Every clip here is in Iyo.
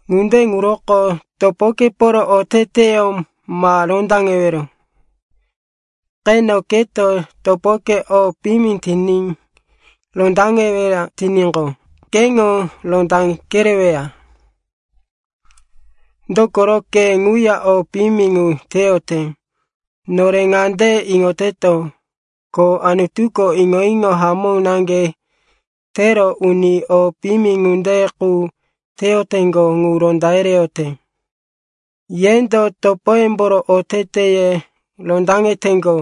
Ŋunde ŋuroko topokeporo oteteyó ma rondaŋewero. Qeno, keto topoke o piyimi tiní rondaŋeweya tiníqo, keŋo ronda kereweya. Dokoro ke ŋuya o piyimi ŋu teyote. Nore ŋande iŋoteto, ko Anutuko iŋo-iŋo hamó naŋge tero uni o piyimi ŋunde qu teyoteŋgo ŋu ronda yereyote. Yendo topoyemboro oteteye rondaŋeteŋgo,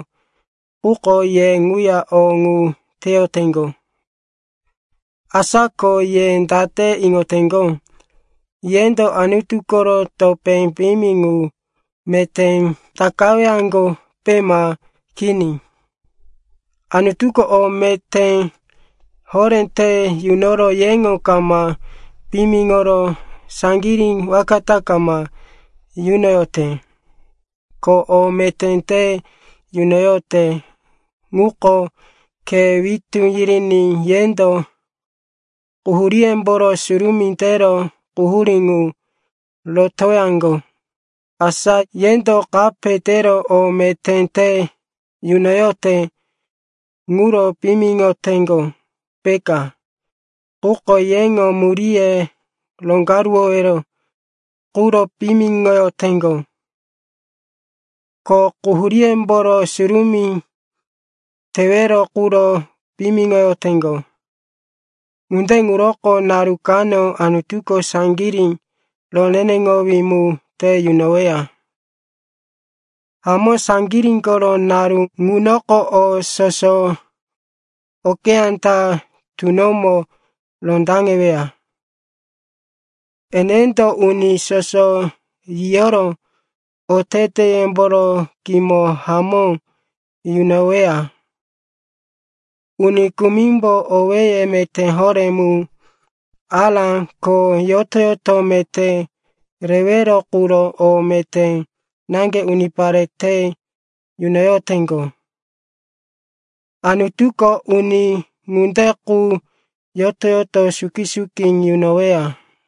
quko ye ŋuya o ŋu teyoteŋgo. Asa ko ye date iŋoteŋgo, yendo Anutu koro topé piyimi ŋu meté takawaŋgope, ma kini? Anutuko o meté horé te yunoro yeŋo kama piyimiŋoro saŋgirí waka ta kama yunoyote. Ko o meté te yunoyote ŋuko khe witú yiriní yendo quhuríyemboro surumí tero quhurí ŋu rotowaŋgo. Asa yendo kape tero o meté te yunoyote ŋuro piyimiŋoteŋgo, peka? Quko yeŋo muríye roŋgaruwowero quro piyimiŋoyoteŋgo, ko quhuríyemboro surumí tewero quro piyimiŋoyoteŋgo. Ŋunde ŋuroko naru kano Anutuko saŋgirí roneneŋowí mu te yunoweya. Hamó saŋgirí koro naru ŋunoko o soso okeyá ta tunomo rondaŋeweya. Enendo “uni soso yiyoro oteteyemboro kimo hamó yunoweya.” Uni kumimbo owé meté horé mu, ará, ko yoto-yoto meté rewero quro o meté naŋge unipare te yunoyoteŋgo. Anutuko uni ŋunde qu yoto-yoto suki-suki yunoweya.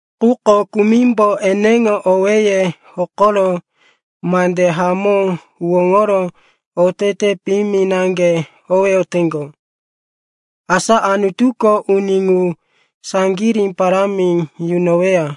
Quko kumimbo eneŋo owéye hokoro mande hamó huwóŋoro otete piyimi naŋge howeyoteŋgo. Asa Anutuko uni ŋu saŋgirí parámi yunoweya.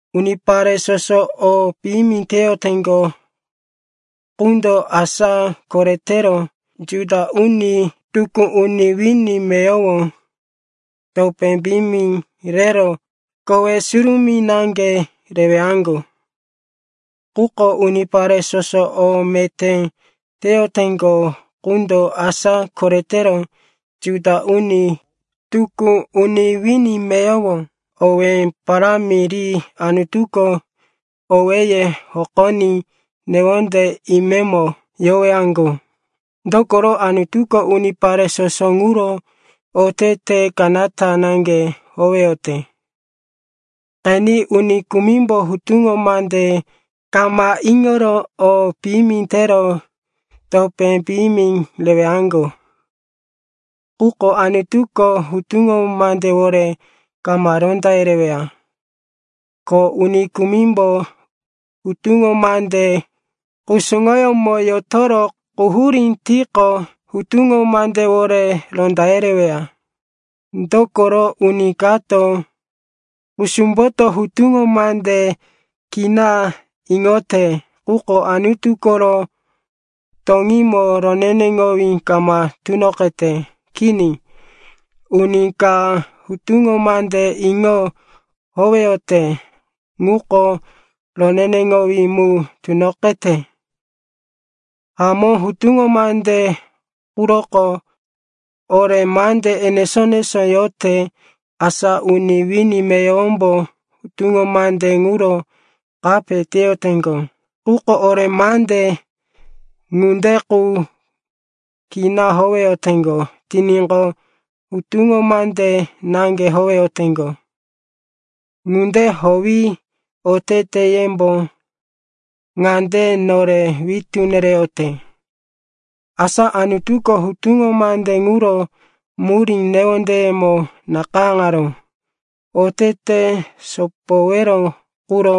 Unipare soso o piyimi teyoteŋgo qundo, asa koretero Juda uni, tukú uni wini meyowo, topé piyimi rero kowe surumí naŋge rewaŋgo. Quko unipare soso o meté teyoteŋgo qundo, asa koretero Juda uni, tukú uni wini meyowo, owé parámi ri Anutuko owéye hokoní newonde imemo yowaŋgo. Dokoro Anutuko unipare soso ŋuro otete kanata naŋge howeyote. Qeni, uni kumimbo hutuŋo mande kama iŋoro o piyimi tero topé piyimi rewaŋgo. Quko Anutuko hutuŋo mandewore kama ronda yereweya. Ko uni kumimbo hutuŋo mande kusuŋoyómo yotoro quhurí tiqo, hutuŋo mandewore ronda yereweya. Dokoro uni kato kusumboto hutuŋo mande kina iŋote quko Anutu koro toŋímo roneneŋowí kama tunoqete. Kini, uni ka hutuŋo mande iŋo howeyote ŋuko roneneŋowí mu tunoqete. Hamó, hutuŋo mande quroko ore mande enesó-enesó yote. Asa uni wini meyowombo hutuŋo mande ŋuro kape teyoteŋgo, quko ore mande ŋunde qu kina howeyoteŋgo tiníqo, hutuŋo mande naŋge howeyoteŋgo. Ŋunde howi oteteyembo ŋande nore witú nereyote, asa Anutuko hutuŋo mande ŋuro murí newondeyemo nakayáŋaró. Otete sopowero quro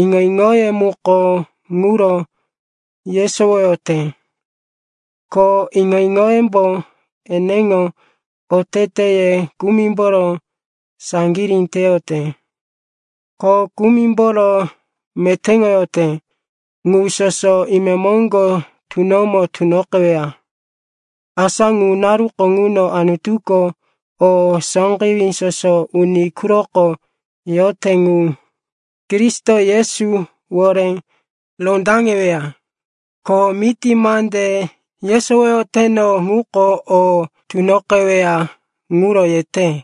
iŋo-iŋoye muko ŋuro yesowoyote, ko iŋo-iŋoyembo eneŋo oteteye kumimboro saŋgirí teyote, ko kumimboro metéŋoyote. Ŋu soso imemoŋgo tunomo tunoqeweya. Asa ŋu naruko ŋuno Anutuko o sóqewí soso uni quroko yote ŋu Kristo Yesuwore rondaŋeweya. Ko miti mande yesowoyoteno ŋuko o tunoqeweya ŋuro yete.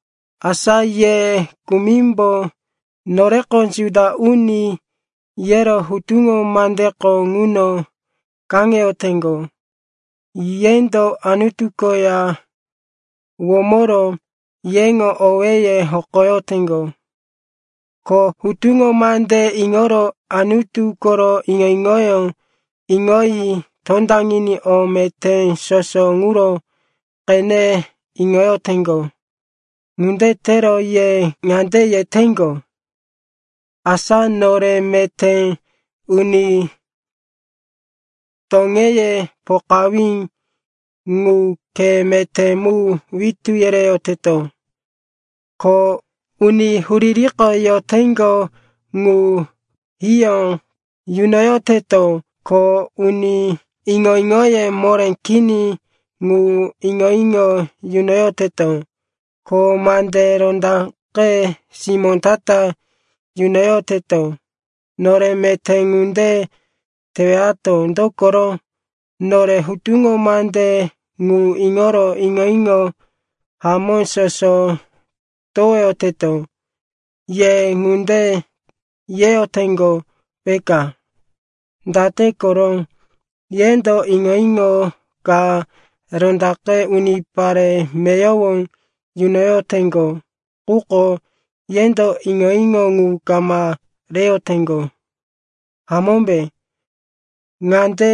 Asa ye kumimbo, noreko Juda uni, yero hutuŋo mandeko ŋuno kaŋeyoteŋgo. Yendo Anutu koya womoro yeŋo owéye hokoyoteŋgo, ko hutuŋo mande iŋoro Anutu koro iŋo-iŋoyó iŋoyi tondaŋiní o meté soso ŋuro qene iŋoyoteŋgo. Ŋunde tero ye ŋande yeteŋgo, asa nore meté uni toŋeye pokawí ŋu khe meté mu witú yereyoteto, ko uni huririko yoteŋgo ŋu hiyó yunoyoteto, ko uni iŋo-iŋoye moré kini ŋu iŋo-iŋo yunoyoteto, ko mande rondaqe simó ta-ta yunoyoteto. Nore meté ŋunde tewato, dokoro nore hutuŋo mande ŋu iŋoro iŋo-iŋo hamó soso towoyoteto. Ye ŋunde yeyoteŋgo, peka. Date koro? Yendo iŋo-iŋo ka rondaqe unipare meyowo yunoyoteŋgo, quko yendo iŋo-iŋo ŋu kama reyoteŋgo, hamómbe? Ŋande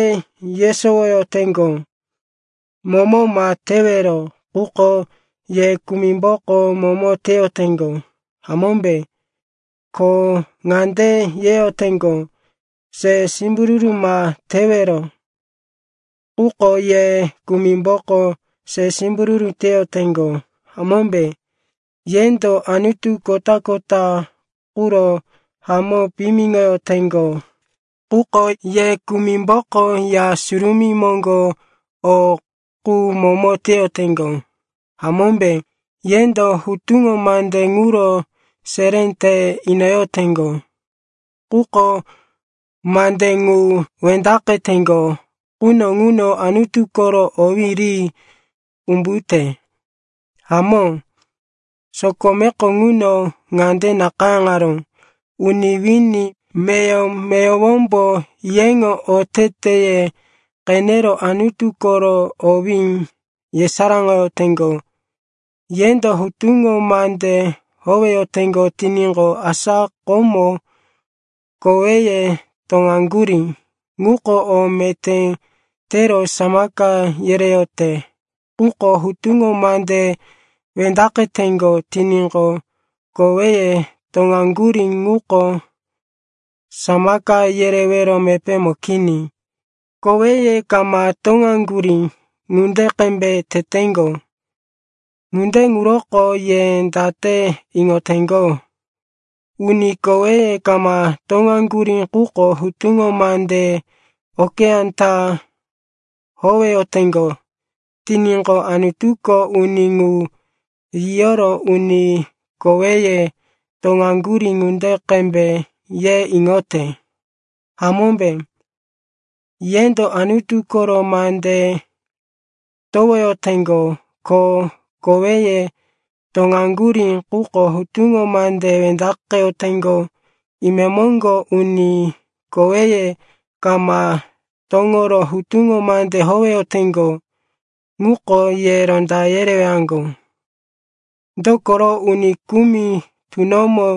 yesowoyoteŋgo, momo ma tewero, quko ye kumimboko momo teyoteŋgo, hamómbe? Ko ŋande yeyoteŋgo, se simbururu ma tewero, quko ye kumimboko se simbururu teyoteŋgo, hamómbe? Yendo anutu kota-kota quro hamó piyimiŋoyoteŋgo, quko ye kumimboko ya surumí moŋgo o qu momo teyoteŋgo, hamómbe? Yendo hutuŋo mande ŋuro seré te inoyoteŋgo, quko mande ŋu wendaqeteŋgo quno ŋuno Anutu koro owí ri umbute. Hamó, sokomeko ŋuno ŋande nakayáŋaró, “Uni wini meyowo-meyowombo yeŋo oteteye qenero Anutu koro owí yesaráŋoyoteŋgo.” Yendo hutuŋo mande howeyoteŋgo tiníqo, asa komo koweye toŋaŋgurí ŋuko o meté tero samaka yereyote. Quko hutuŋo mande wendaqeteŋgo tiníqo, koweye toŋaŋgurí ŋuko samaka yerewero mepémo kini. Koweye kama toŋaŋgurí ŋunde qembe teteŋgo. Ŋunde ŋuroko ye date iŋoteŋgo? Uni koweye kama toŋaŋgurí quko hutuŋo mande okeyá ta howeyoteŋgo tiníqo, Anutuko uni ŋu yiyoro, uni koweye toŋaŋgurí ŋunde qembe, ye iŋote, hamómbe? Yendo Anutu koro mande towoyoteŋgo ko koweye toŋaŋgurí, quko hutuŋo mande wendaqeyoteŋgo. Imemoŋgo uni koweye kama toŋoro hutuŋo mande howeyoteŋgo ŋuko ye ronda yerewaŋgo. Dokoro uni kumi tunomo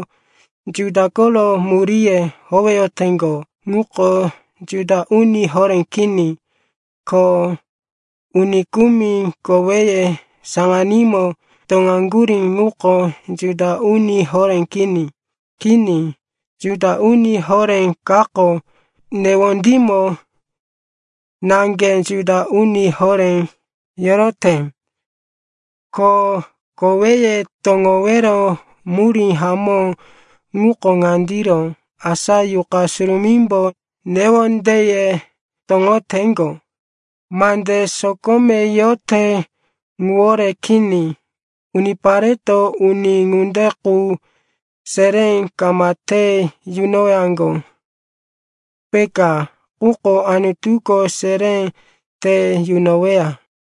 Juda koro muríye howeyoteŋgo ŋuko Juda uni horé kini. Ko uni kumi koweye saŋanímo toŋaŋgurí ŋuko Juda uni horé kini. Kini, Juda uni horé kako newondímo naŋge Juda uni horé yorote. Ko koweye toŋowero murí hamó ŋuko ŋandiro, asa Yuqa Surumímbo newondeye toŋoteŋgo, mande sokome yote ŋuwore kini. Unipareto uni ŋunde qu seré kama te yunowaŋgo, peka, quko Anutuko seré te yunoweya.